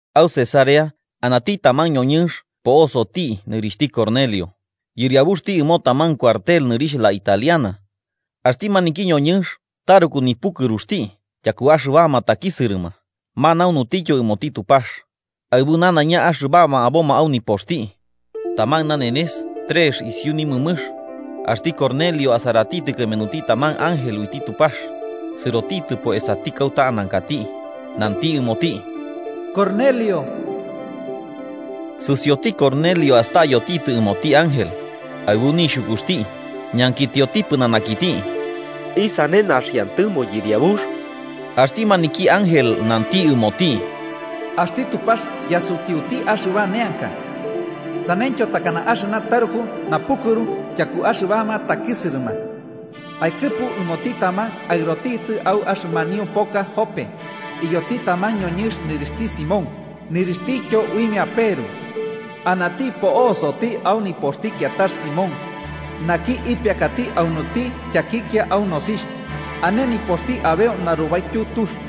Au Cesarea anati taman ñoñɨnx po'osoti nɨrixhti Cornelio, yɨriabuxti ɨmo taman cuartel nɨrixh “La Italiana.” Axti maniki ñoñɨnx taruku nipukɨruxti tyaku axɨbama takisɨrɨma manaunutityo ɨmoti Tupax, aɨbu nanaiña axɨbama aboma au nipoxti. Taman nanenes, trex isiu nimɨmɨx, axti Cornelio asaratitɨ kɨmenuti taman ángel uiti Tupax, sɨrotitɨpo esati kauta anankati. Nanti ɨmoti: ¡Cornelio! Sɨsioti Cornelio astayotitɨ ɨmoti ángel, aɨbu nixhukuxti ñankitioti pɨnanakiti: “¿Isane, naxiantɨmo Yɨriabux?” Axti maniki ángel nanti ɨmoti: “Axti Tupax yasutiuti axɨba neanka, saneityo takana axɨna taruku napukɨru tyaku axɨbama takisɨrɨma. Akɨpu ɨmoti taman aɨrotitɨ au axɨmanio poka Jope iyoti taman ñoñɨnx nɨrixhti Simón, nɨrixhtityo uimia Peru. Anati po'soti au nipoxti kiatax Simón, naki ipiakati aunuti tyakikia au nosixh ane nipoxti abeu narubaityu tux.”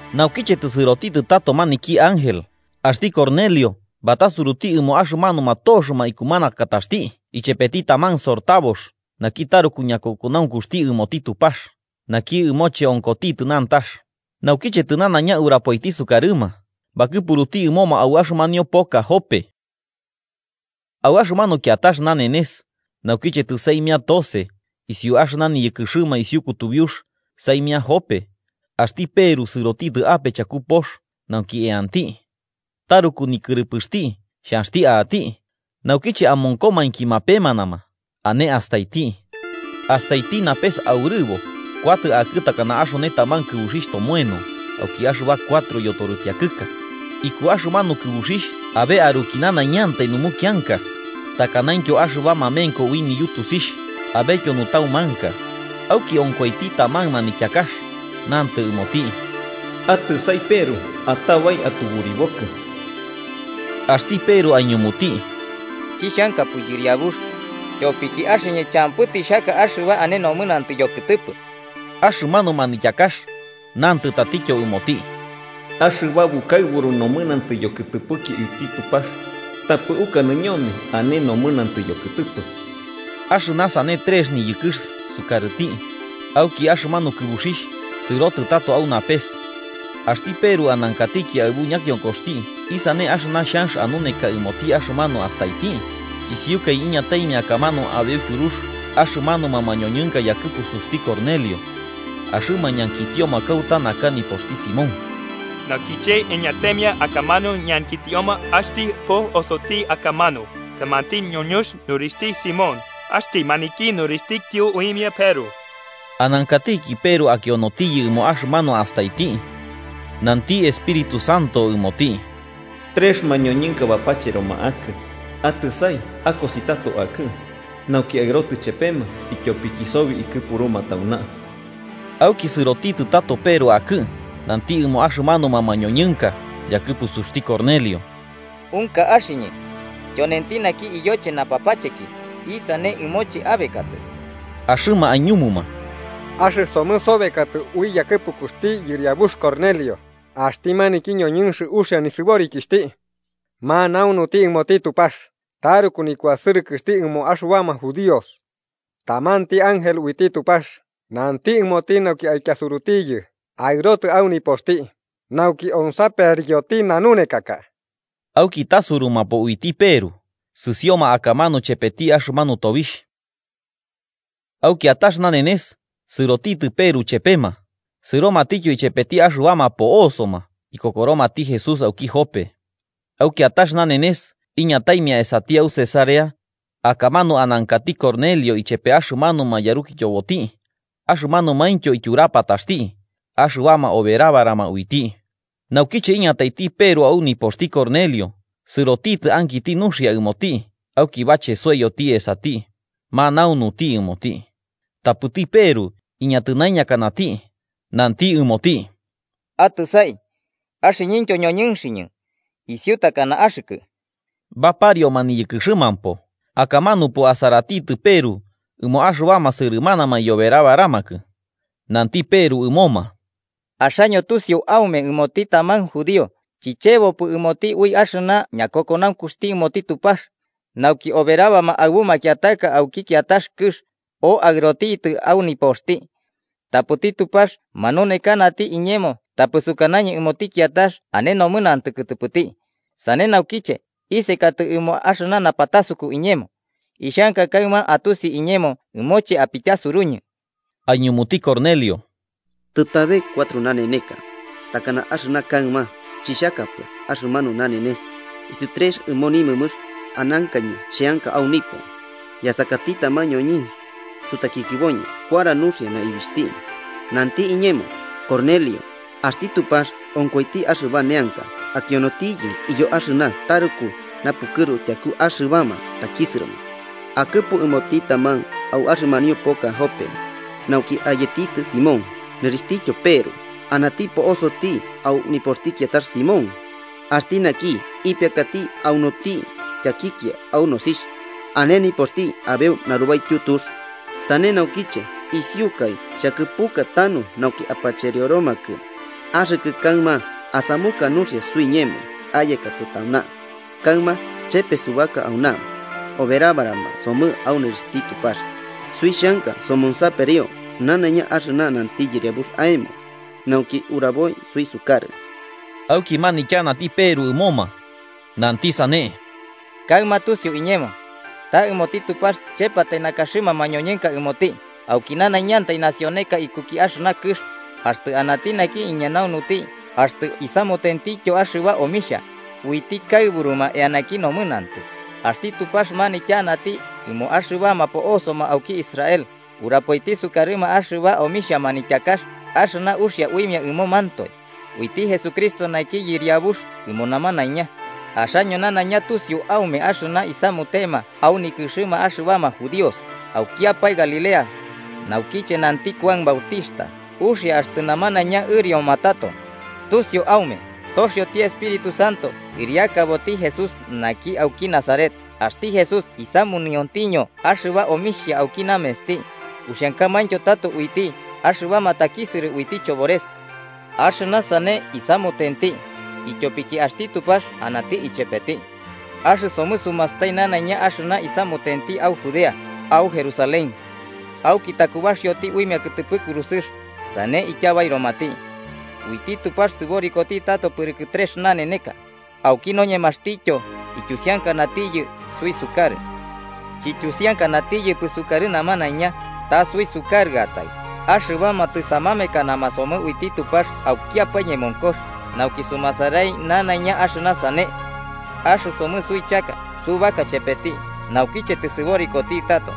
Naukiche tɨsɨrotitɨ tato maniki ángel, axti Cornelio batasuruti ɨmo axɨmanuma toxɨma ikumanakataxti ichepeti taman sortabox naki taruku ñakokonaunkuxti ɨmoti Tupax naki ɨmoche onkotitɨ nantax, naukiche tɨnanaiña urapoiti sukarɨma, bakɨpuruti ɨmoma au axɨmanio poka Jope. Au axɨmanu kiatax nanenes, naukiche tɨsaimia tose isiu axɨna niyɨkɨrɨma isiu kutubiux saimia Jope, axti Peru sɨrotitɨ ape chaku pox nauki eanti. Taruku nikɨrɨpɨxti xhanxti a'ati, naukiche amonkomainki mapemanama, ane astaiti: Astaiti napes aurɨbo, kuatɨ akɨ takana axone taman kɨbuxixh tomoeno auki axɨba cuatro yotoripiakɨka. Iku axɨmanu kɨbuxixh abe aruki nanaiñantai numukianka, takanaintyo axɨba mamenko ui niyutusixh abetyo nutaumanka. Auki onkoiti taman manityakax, nantɨ ɨmoti: “Atɨsai Peru. Atabai atuburibokɨ.” Axti Peru aiñumuti: “Chixhankapɨ, Yɨriabux. Tyopiki axɨñɨ champɨ tixhaka axɨba ane nomɨnantɨ yokɨtɨpɨ.” Axɨmanu manityakax nantɨ tatityo ɨmoti: “Axɨba bukaɨburu nomɨnantɨ yokɨtɨpɨki uiti Tupax tapɨ ukanɨ ñome ane nomɨnantɨ yokɨtɨpɨ.” Axɨna sane trex niyɨkɨx sukarɨti, auki axɨmanu kɨbuxixh sɨrotɨ tato au napes. Axti Peru anankatiki aɨbu ñakionkoxti isane axɨna xhanx anuneka ɨmoti axɨmanu astaiti, isiukai iñataimia akamanu abeu tyurux axɨmanuma mañoñɨnka yakɨpusuxti Cornelio, axɨma ñankitioma kauta naka nipoxti Simón. Naukiche iñataimia akamanu ñankitioma axtɨ po'osoti akamanu tamanti ñoñɨnx nɨrixhti Simón, axti maniki nɨrixhtityo uimia Peru. Anankatiki Peru akionotiyɨ ɨmo axɨmanu astaiti, nanti Espíritu Santo ɨmoti: “Trex mañoñɨnka bapacheroma akɨ. Atɨsai akosi tato akɨ, nauki aɨrotɨ chepema, ityopiki sobi ikɨpuruma tauna.” Auki sɨrotitɨ tato Peru akɨ nanti ɨmo axɨmanuma mañoñɨnka yakɨpusuxti Cornelio: –Unka axɨñɨ tyonenti naki iyoche napapacheki. ¿Isane ɨmoche abekatɨ? Axɨma aiñumuma: –Axɨsomɨ sobekatɨ ui yakɨpukuxti yɨriabux Cornelio, axti maniki ñoñɨnx uxia nɨsɨborikixhti, manaunuti ɨmoti Tupax taruku nikuasɨrɨkɨxti ɨmo axɨbama judíos. Tamanti ángel uiti Tupax nanti ɨmoti nauki aityasurutiyɨ aɨrotɨ au nipoxti, nauki onsaperioti nanunekaka. Auki tasurumapo uiti Peru, sɨsioma akamanu chepeti axɨmanu tobixh. Au kiatax nanenes, sɨrotitɨ Peru chepema, sɨromatityo ichepeti axɨbama po'osoma ikokoromati Jesús auki Jope. Au kiatax nanenes iñataimia esati au Cesarea, akamanu anankati Cornelio ichepe axɨmanuma yarukityoboti axɨmanumaintyo ityurapataxti axɨbama oberabarama uiti. Naukiche iñataiti Peru au nipoxti Cornelio, sɨrotitɨ ankiti nuxia ɨmoti auki bachesoiyoti esati, manaunuti ɨmoti. Tapɨti Peru iñatɨnaiñakanati, nanti ɨmoti: –Atɨsai, axɨñɨntyo ñoñɨnxɨñɨ, isiu takana axɨkɨ. Baparioma niyɨkɨxɨmampo, akamanupo asaratitɨ Peru ɨmo axɨbama sɨrɨmanama iyoberabaramakɨ. Nanti Peru ɨmoma: –Axaño tusiu aume ɨmoti taman judío chichebopɨ ɨmoti ui axɨna ñakokonaunkuxti ɨmoti Tupax, nauki oberabama aɨbu makiataka auki kiatax kɨx o aɨrotitɨ au nipoxti. Tapɨti Tupax manunekanati iñemo tapɨ sukanañɨ ɨmoti kiatax ane nomɨnantɨ kɨtɨpɨti. Sane naukiche, isekatɨ ɨmo axɨna napatasuku iñemo. Ixhanka kaɨma atusi iñemo ɨmoche apityasuruñɨ. Aiñumuti Cornelio: –Tɨtabe cuatro naneneka, takana axɨna kaɨma, chixhakapɨ axɨmanu nanenes. Isiu trex ɨmo nimɨmɨx anankañɨ xheanka au nipo, yasakati taman ñoñɨnx sutakikiboñɨ kuara nuxia naibixhti. Nanti iñemo: ‘Cornelio, axti Tupax onkoiti axɨba neanka akionotiyɨ iyo axɨna taruku napukɨru tyaku axɨbama takisɨrɨma. Akɨpu ɨmoti taman au axɨmanio poka Jope nauki ayetitɨ Simón, nɨrixhtityo Peru. Anati po'soti au nipoxti kiatax Simón, axti naki ipiakati aunuti tyakikia au nosixh ane nipoxti abeu narubaityu tux.’ Sane naukiche isiukai xhakɨpuka tanu nauki apacherioromakɨ, axɨkɨ kaɨma asamuka nuxia suiñemo ayekatɨ tauna. Kaɨma chepe subaka auna oberabarama somɨ au nɨrixhti Tupax, suixhanka somonsaperio nanaiña axɨna nanti Yɨriabux aemo, nauki uraboi suisukarɨ. Auki manityanati Peru ɨmoma, nanti sane: –Kaɨma tusiu iñemo ta ɨmoti Tupax chepatai nakaxɨma mañoñɨnka ɨmoti, auki nanaiñantai nacióneka ikuki axɨna kɨx, axtɨ anati naki iñanaunuti axtɨ isamutentityo axɨba omixha, uiti kaɨburuma eanaki nomɨnantɨ. Axti Tupax manityanati ɨmo axɨbama po'osoma auki Israel, urapoiti sukarɨma axɨba omixha manityakax axɨna uiche uxia uimia ɨmomantoe, uiti Jesucristo naki Yɨriabux ɨmo namanaiña. Axaño nanaiña tusiu aume axɨna isamutema au nikɨxɨma axɨbama judíos, aukiapae Galilea, naukiche nanti Kuan Bautixhta uxia axtɨ namanaiña ɨrioma tato. Tusiu aume, toxioti Espíritu Santo ɨriakaboti Jesús naki auki Nazaret, axti Jesús isamuniontiño axɨba omixhia auki namensti, uxiankamaintyo tato uiti axɨbama takisɨrɨ uiti chobores. Axɨna sane isamutenti, ityopiki axti Tupax anati ichepeti. Axɨsomɨ sumastai nanaiña axɨna isamutenti au Judea, au Jerusalén. Auki takubaxioti uimia kɨtɨpɨ kurusɨx sane ityabairomati. Uiti Tupax sɨborikoti tato pɨrɨkɨ trex naneneka, auki noñemaxtityo ityusiankanatiyɨ suisukarɨ. Chityusiankanatiyɨpɨ sukarɨ namanaiña, ta suisukarɨatai, axɨbama tɨsamamekana somɨ uiti Tupax aukiapae ñemonkox nauki sumasarai nanaiña axɨna sane. Axɨsomɨ suichaka subaka chepeti naukiche tɨsɨborikoti tato.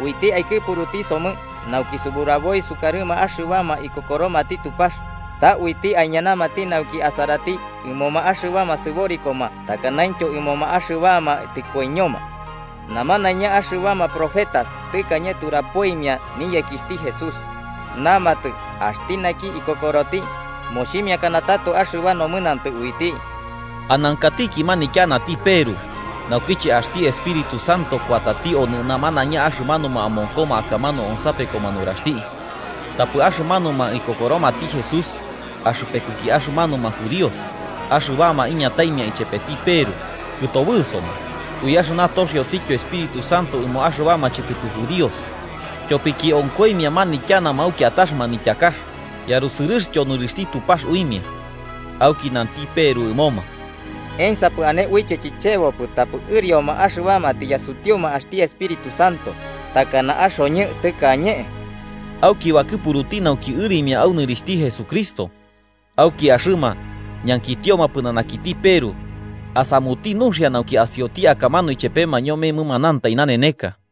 Uiti aikɨpuruti somɨ nauki suburaboi sukarɨ axɨbama ikokoromati Tupax, ta uiti aiñanati nauki asaraiti ɨmoma axɨbama sɨborikoma takanaintyo ɨmoma axɨbama tɨkoiñoma. Namanaiña axɨbama profetas tɨkañe turapoimia niyekixhti Jesús, namatɨ axti naki ikokoroti, moximiakana tato axɨba nomɨnantɨ uiti. Anankatiki manityanati Peru, naukiche axti Espíritu Santo kuatati onɨ namanaiña axɨmanuma amonkoma akamanu onsapekoma nuraxti. Tapɨ axɨmanuma ikokoromati Jesús, axɨpekuki axɨmanuma judíos axɨbama iñataimia ichepeti Peru, kɨtobɨsoma, ui axɨna toxiotityo Espíritu Santo ɨmo axɨbama chɨtɨpɨ judíos. Tyopiki onkoimia ñanityanama au kiatax manityakax yarusɨrɨxtyo nɨrixhti Tupax uimia. Auki nanti Peru ɨmoma: –¿Emsapɨ ane uiche chichebopɨ tapɨ ɨrioma axɨbama tiyasutiuma axti Espíritu Santo takana axoñɨ tɨkañe? Auki bakɨpuruti nauki ɨrimia au nɨrixhti Jesucristo. Auki axɨma ñankitioma pɨnanakiti, Peru asamuti nuxia nauki asioti akamanu ichepema ñome mɨmanantai naneneka.